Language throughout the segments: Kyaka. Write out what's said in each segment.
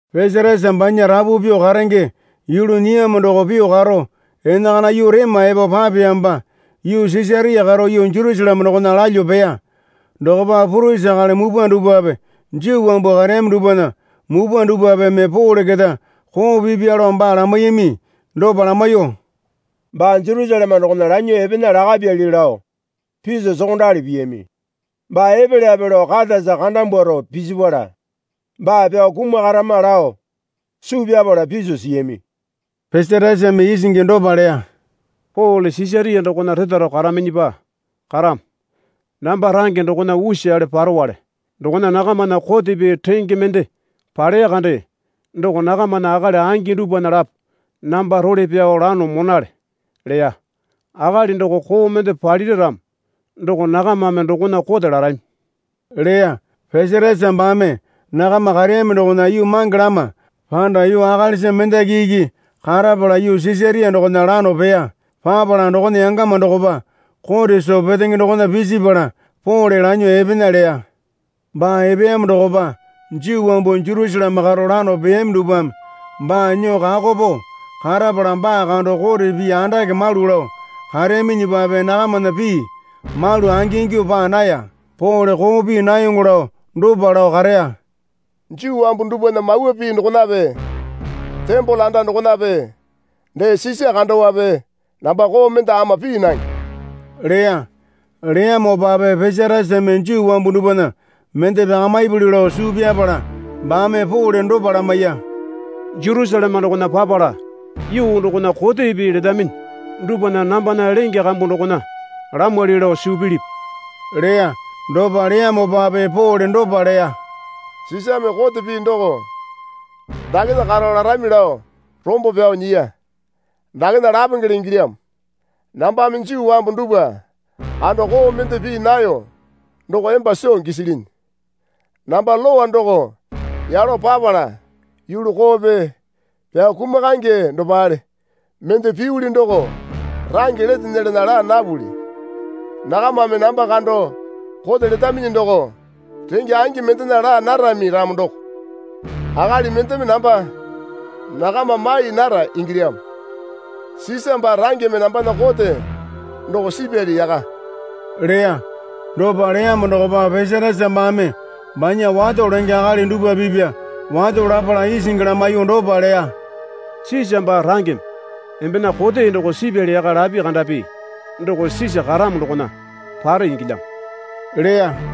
Pesatasa banya rapu pyuo karenge yulu nyiyamo doo pyuo karo enakana yuu rema epo papeyamopa yuu Sisaria karo yuu Jerusaleme dokona lalyuo peya. Dokopa purisi akali mupwa dupwape Juu wambu kareyami dupwana mupwa dupwapeme Pole keta koo pipya lao baa lamaiyami. Dopa lamaiyuo, Baa Jerusaleme dokona lanyuo epena lakapyali lao piso sokondali piyami. Baa epelyape lao katasa karanyimbwaro pisipala baa pyao kumakarama lao suu pyapala piso siyami. Pesatasame isingi dopa leya. Pole Sisaria dokona retaro karaminyipa karamo. Namba range dokona usale parowale. Dokona nakamana kote pii renge mende paleya kande doko nakamana akali angi dupwana lapo namba role pyao lano monale leya. Akali doko koo mende palira ramo doko nakamame dokona kote larami leya. Pesatasa baame nakama kareyami dokona yuu mange lama panda yuu akalisa mendaki iki karapala yuu Sisaria dokona lano peya. Papala dokona yangama dokopa kote soo petenge dokona pisipala Pole lanyuo epena leya. Baa epeyamo dokopa Juu wambu Jerusaleme karo lano peyami dupwame baa nyuo kako pao karapala baa kando kote pii andake malu lao kareyaminyipape nakamana pii malu angingyuo paa naya. Pole koo pii nayoŋo lao dopa lao kareya. Juu wambu dupwana Mawa Pii dokonape tembole anda dokonape dee Sisa kandowape namba koo mende ama pii nange, leya. Leyamopape Pesatasame Juu wambu dupwana mende pyakamipuli lao suu pyapala baame Pole dopa lamaiya. Jerusaleme dokona papala yuu dokona kote pii letaminyi dupwana nambana lenge kambu dokona lamwali lao suu pilipi? leya. Dopa leyamopape Pole dopa leya. Sisame kote pii doko dakena karo larami lao rombo pyao nyiya. Dakena lapengele ingilyamo. Nambame Juu wambu dupwa kando koo mende pii nayo doko emba soo gisilinyi. Namba lowa doko yalo papala yulu koope pyao kumakaenge dopale mende piyuli doko range lete nyelana laa napuli. Nakamame namba kando kote letaminyi doko renge angi mendena laa narami ramo doko akali mendeme namba nakama mai nara ingilyamo. Sisa baa rangeme nambana kote doko sipyali yaka leya. Dopa leyamo dokopa Pesatasa baame banya wato lenge akali dupwa pipya wato lapala isingi lamaiyuo dopa leya. Sisa baa rangeme embena kote doko sipyali yaka lapi kandapi doko Sisa karamo dokona pare ingilyamo leya.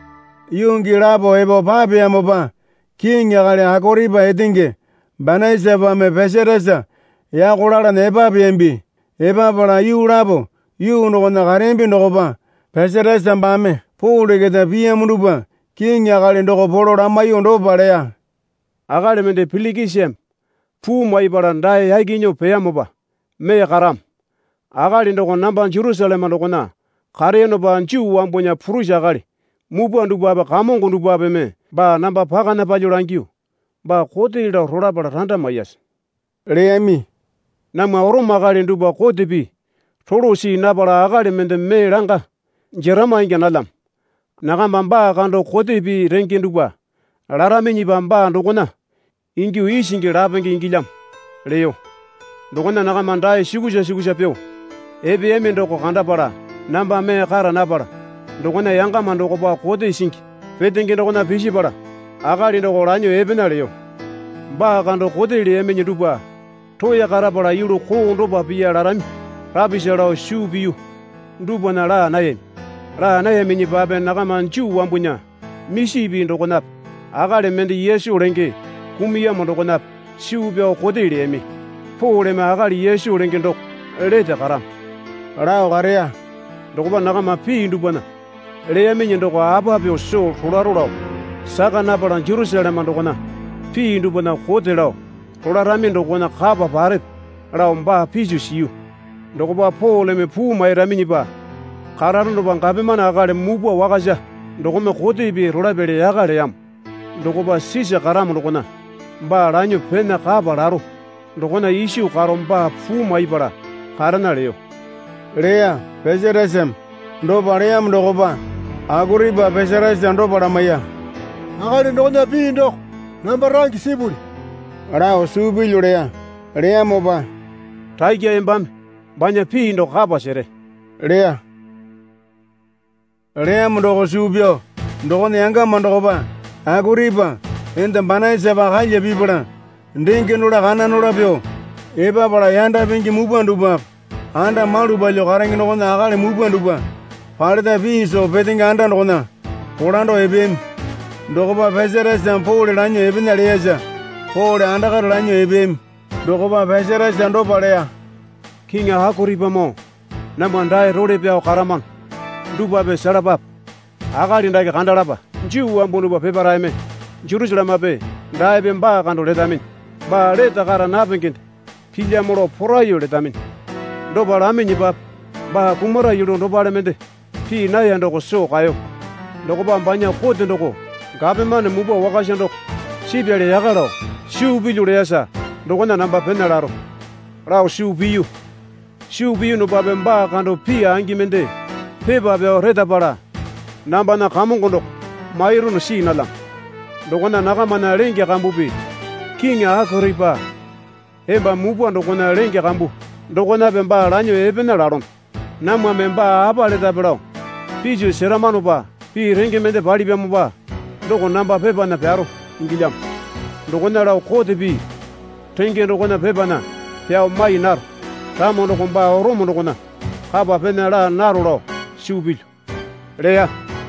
Yuu gii lapo epo papeyamopa kiŋi akali Akoripa etenge Banaisapame Pesatasa yako lalana epapeyambi. Epapala yuu lapo yuu dokona kareyambi dokopa Pesatasa baame Pole keta piyamo dupwa kiŋi akali doko polo lamaiyuo dopa leya. Akali mende Pilikisame puu maipala dae yaki nyuo peyamopa mee karamo. Akali doko namba Jerusaleme dokona kareyonopa Juu wambunya purisi akali mupwa dupwape kamongo dupwapeme baa namba pakana palyuo langyuo, Baa kote lao rolapala randa maiyase, leyami. Namwa Orome akali dupwa kote pii rolo see napala akali mende mee langa jerama ingya nalyamo. Nakamba baa kando kote pii renge dupwa laraminyipa baa dokona ingyuo isingi lapenge ingilyamo leyo. Dokona nakama dae sukusa sukusa pyuo epeyami doko kandapala namba mee kara napala dokona yangama dokopa kote singi petenge dokona pisipala akali doko lanyuo epena leyo. Baa kando kote leyaminyi dupwa roya karapala yulu koo dopa piya larami rapisa lao suu piyu dupwana laa nayami. Laa nayaminyipape nakama Juu wambunya misi pii dokonape akali mende Yesu lenge kumuyamo dokonape suu pyao kote leyami. Poleme akali Yesu lenge doko lete karamo, lao kareya. Dokopa nakama pii dupwana leyaminyi doko apa pyuo soo rolaro lao saka napala Jerusaleme dokona pii dupwana kote lao rolarami dokona kapa parepe lao baa piso siyu. Dokopa Poleme puu mairaminyipa kararonopa gapomane akali mupwa wakasa dokome kote pii rolapyali yaka leyamo dokopa Sisa karamo dokona baa lanyuo pena kapa laro dokona iso karo baa puu maipala karena leyo, leya Pesatasame. Dopa leyamo dokopa Akoripa Pesatasa dopa lamaiya. Akali dokona pii doko namba range sipuli lao suu pilyu leya. Leyamopa, Rakya embame banya pii doko kapa sere leya. Leyamo doko suu pyao dokona yangama dokopa Akoripa enda Banaisapa kalya pipala dengenola kananola pyuo epapala yanda pingi mupwa dupwape anda malu palyuo karenge dokona akali mupwa dupwa paleta pii soo petenge anda dokona kolando epeyami. Dokopa Pesatasame Pole lanyuo epena leyasa Pole andakare lanyuo epeyami. Dokopa Pesatasa dopa leya. Kiŋi Akoripamoo namwa dae role pyao karamano dupwape selapape. Akali dake kandalapa. Juu wambu dupwa peparaeme Jerusalemepe daepe baa kando letaminyi. Baa lete kara napengende pilyamo lao poraiyuo letaminyi. Dopa laminyipape baa kumara yulu dopale mende pii naya doko soo kaeyo. Dokopa banya kote doko gapomane mupwa wakasa doko sipyali yaka lao suu pilyu leyasa dokona namba pena laro lao suu piyu. Suu piyunupape baa kando pii angi mende pepa pyao retapala nambana kamongo doko mairunu see nalyamo. Dokona nakamana lenge kambupi kiŋi Akoripa emba mupwa dokona lenge kambu dokonape baa lanyuo epena lalono. Namwame baa apa letape lao piso seramanopa pii renge mende palipyamopa doko namba pepana pyaro ingilyamo. Dokona lao kote pii renge dokona pepana pyao mai naro ramo doko baa Orome dokona kapa pena laa naro lao suu pilyu, leya.